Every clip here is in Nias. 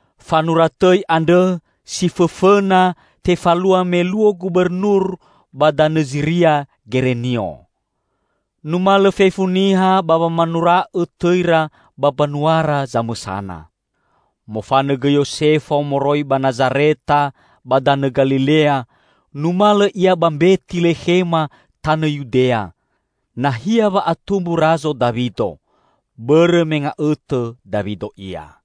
Fanura tõi andrõ si fõfõna tefalua me luo gubernur ba danõ Ziria Gerenio. Numalõ fefu niha ba wamanura'õ tõira ba mbanuara zamõsana. Mofanõ gõi Yosefo moroi ba Nazareta ba danõ Galilea, numalõ ia ba Mbetilekhema tanõ Yudea, nahia wa'atumbu Razo Dawido; bõrõ me nga'õtõ Dawido ia.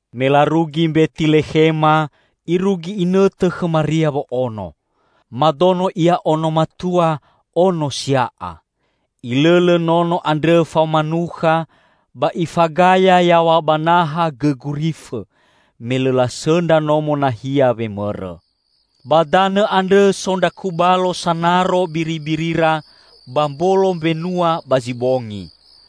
Me larugi Mbetilekhema, irugi inõtõ khõ Maria wo'ono. Madono ia ono matua, ono sia'a. Ilõlõ nono andrõ faoma nukha, ba ifagaya yaw̃a ba naha gõ gurifõ; me lõ lasõndra nomo nahia wemõrõ. Ba danõ andrõ so ndra kubalo sanaro biribirira ba mbolo mbenua ba zi bongi.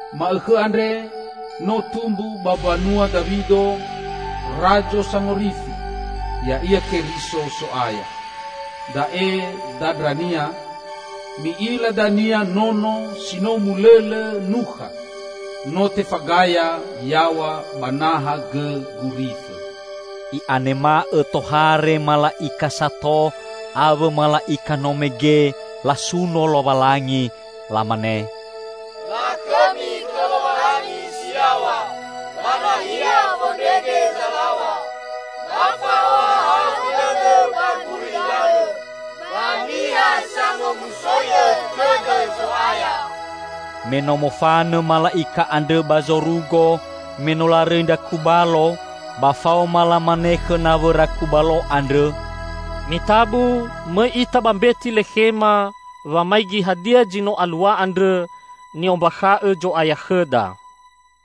Ma'õkhõ andre no tumbu ba mbanua Dawido, Razo Sangorifi, ya'ia Keriso So'aya. Da'e dandrania: Mi'ila dania Nono si no mulõlõ nukha, no tefagaya yaw̃a ba naha gõ gurifõ." I'anema'õ tohare mala'ika sato awõ mala'ika no mege, lasuno Lowalangi. Lamane, "Lakhõmi khõ Lowalangi si yaw̃a ba nahia fondrege zalaw̃a! Ba fa'ohahau dõdõ ba gulidanõ, ba niha sangomusoi'õ tõdõ Zo'aya!" Me no mofanõ mala'ika andrõ ba zorugo, me no larõi ndra kubalo, ba faoma lamane khõ nawõra kubalo andrõ, "Mitabu mõi ita ba Mbetilekhema wamaigi hadia zi no alua andrõ, ni'ombakha'õ Zo'aya khõda!"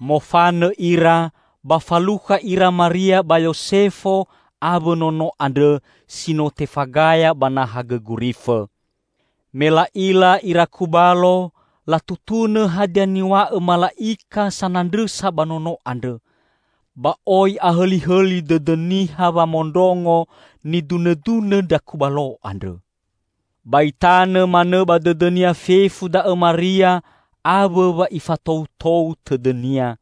Mofanõ ira, ba falukha ira Maria ba Yosefo awõ Nono andrõ si no tefagaya ba naha gõ gurifõ. Me la'ila ira kubalo, latutunõ hadia niw̃a'õ mala'ika sanandrõsa ba nono andrõ. Ba oi ahõlihõli dõdõ niha wamondrongo nidunõdunõ ndra kubalo andrõ. Ba itanõ manõ ba dõdõnia fefu da'õ Maria awõ wa ifatoutou tõdõnia.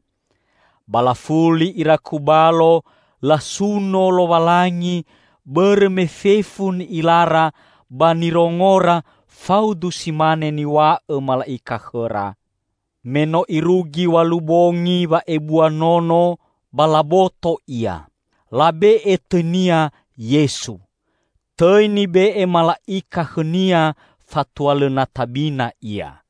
Ba lafuli ira kubalo, lasuno Lowalangi bõrõ me fefu ni'ilara ba nirongora faudu si mane niw̃a'õ mala'ika khõra. Me no irugi w̃alu bongi wa'ebua Nono, ba laboto Ia. Labe'e tõi-Nia Yesu, tõi nibe'e mala'ika khõ-Nia fatua lõ na tabina Ia.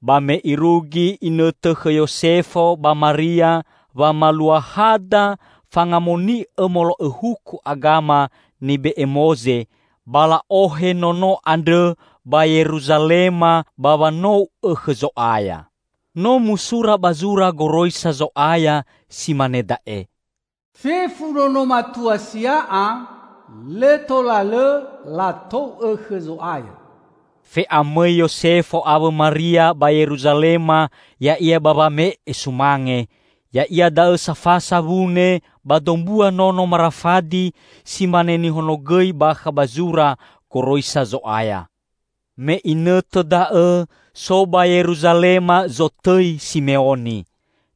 Ba me irugi inõtõ khõ Yosefo ba Maria wamalua hada fangamoni'õ molo'õ huku agama nibe'e Moze, ba la'ohe Nono andrõ ba Yeruzalema ba wanou'õ khõ Zo'aya. No musura ba zura Goroisa Zo'aya si mane da'e, "Fefu nono matua sia'a, lõ tola lõ latou'õ khõ Zo'aya." Fe'amõi Yosefo awõ Maria ba Yeruzalema ya'ia ba wame'e sumange, ya'ia da'õ safasa wune ba dombua nono marafadi, si mane nihonogõi bakha ba zura goroisa Zo'aya. Me inõtõ da'õ so ba Yeruzalema zotõi Simeoni.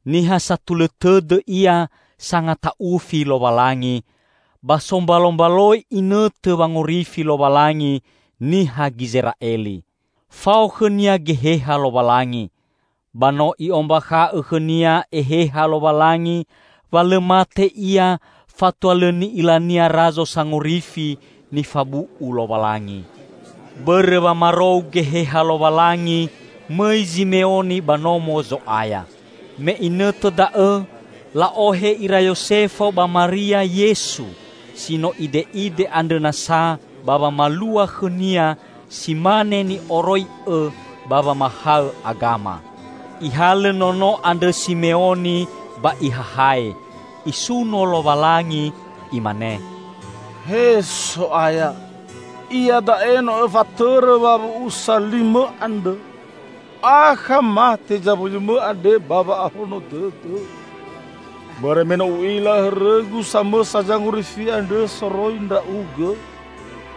Niha satulõ tõdõ ia, sangata'ufi Lowalangi ba sombalombaloi inõtõ wangorifi Lowalangi niha Gizera'eli. Fao khõnia Geheha Lowalangi, ba no I'ombakha'õ khõnia Eheha Lowalangi wa lõ mate ia fatua lõ ni'ilania Razo Sangorifi nifabu'u Lowalangi. Bõrõ wamarou Geheha Lowalangi, mõi Zimeoni ba Nomo Zo'aya. Me inõtõ da'õ la'ohe ira Yosefo ba Maria Yesu si no ide'ide andrõ nasa ba wamalua khõ-Nia si mane ni'oroi'õ ba wamahaõ agama. Ihalõ Nono andrõ Simeoni ba ihahae, isuno Lowalangi, Imane, "He So'aya, iada'e no Õfatõrõ wawu'usa li-Mõ andrõ. Akha mate zawuyu-Mõ andre ba wa'ahono dõdõ. Bõrõ me no u'ila hõrõgu samõsa Zangorifi andrõ soroi Ndra'ugõ.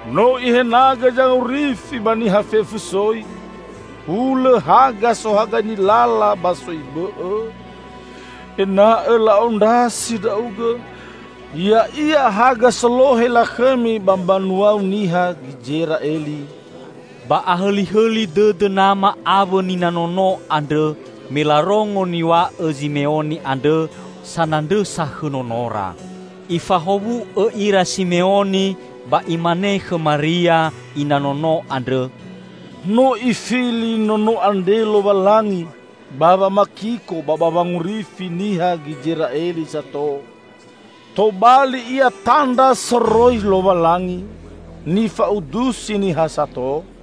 No Ihenagõ Zangorifi ba niha fefu soi: Hulõ haga sohagaini lala ba soi bõ'õ, ena'õ la'ondrasi Ndra'ugõ; ya'ia haga solohe lakhõmi ba mbanua-U niha Gizera'eli." Ba ahõlihõli dõdõ nama awõ nina Nono andrõ, me larongo niw̃a'õ Zimeoni andrõ sanandrõsa khõ Nonora. Ifahowu'õ ira Simeoni ba imane khõ Maria, ina Nono andrõ, "No Ifili Nono andre Lowalangi ba wamakiko ba ba wangorifi niha Gizera'eli sato. Tobali Ia tandra soroi Lowalangi, nifa'udusi niha sato,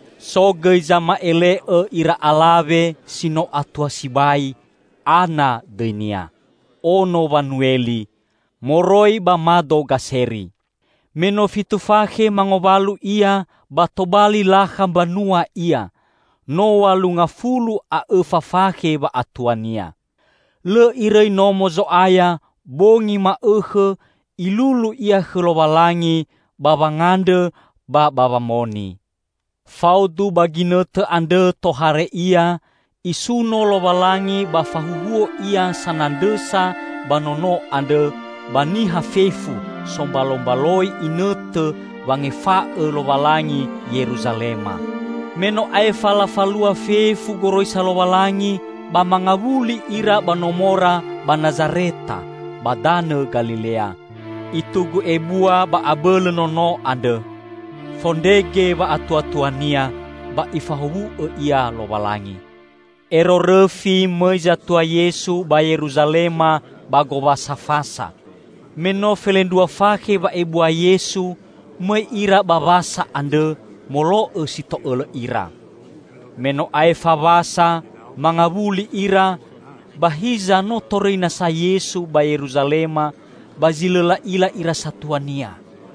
So gõi zama'ele'õ ira alawe si no atua sibai, Ana dõinia, ono Wanueli, moroi ba mado Gaseri. Me no fitu fakhe mangowalu ia, ba tobali lakha mbanua ia, no w̃alu ngafulu a õfa fakhe wa'atuania. Lõ irõi Nomo Zo'aya. Bongi ma'õkhõ ilulu ia khõ Lowalangi ba wangandrõ ba ba wamoni. Faudu ba ginõtõ andrõ tohare ia, isuno Lowalangi ba fahuhuo ia sanandrõsa ba Nono andrõ ba niha fefu sombalombaloi inõtõ wangefa'õ Lowalangi Yeruzalema. Me no aefa lafalua fefu goroisa Lowalangi, ba mangawuli ira ba nomora ba Nazareta ba danõ Galilea. Itugu ebua ba abõlõ Nono andrõ. Fondrege wa'atuatua-Nia ba Ifahowu'õ Ia Lowalangi. Ero rõfi mõi zatua Yesu ba Yeruzalema ba Gowasa Fasa. Me no felendrua fakhe wa'ebua Yesu, mõi ira ba Wasa andrõ, molo'õ si to'õlõ ira. Me no aefa Wasa, mangawuli ira, ba hiza no torõi nasa Yesu ba Yeruzalema, ba zi lõ la'ila ira satua-Nia.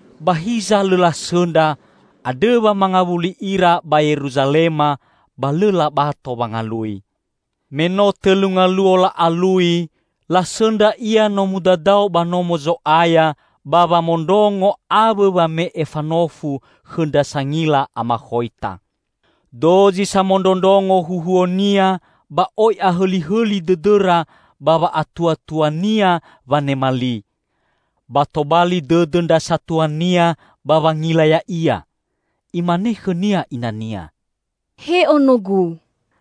Ba hiza lõ lasõndra, andrõ wa mangawuli ira ba Yeruzalema ba lõ labato wangalui. Me no tõlu ngaluo la'alui, lasõndra Ia no mudadao ba Nomo Zo'aya ba wamondrongo awõ wame'e fanofu khõ ndra sangila amakhoita. Dozi samondrondrongo huhuo-Nia ba oi ahõlihõli dõdõra ba wa'atuatua-Nia wanema li. Ba tobali dõdõ ndra satua-Nia ba wangila Ya'ia. Imane khõ-Nia ina-Nia, "He Onogu,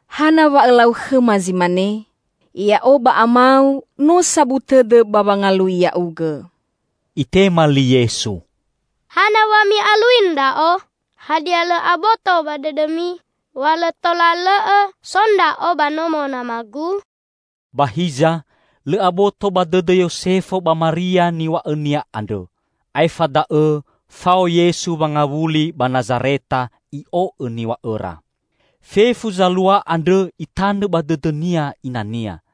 hana wa Õlau khõma zi mane? Ya'o ba Ama-U no sabu tõdõ ba wangalui Ya'ugõ!" Itema li Yesu, "Hana wa mi'alui Ndra'o? Hadia lõ aboto ba dõdõmi wa lõ tola lõ'õ so Ndra'o ba nomo nama-Gu?" Ba hiza, lõ aboto ba dõdõ Yosefo ba Maria niw̃a'õ-Nia andrõ. Aefa da'õ fao Yesu wangawuli ba Nazareta, I'o'õ niw̃a'õra. Fefu zalua andrõ itanõ ba dõdõnia ina-Nia.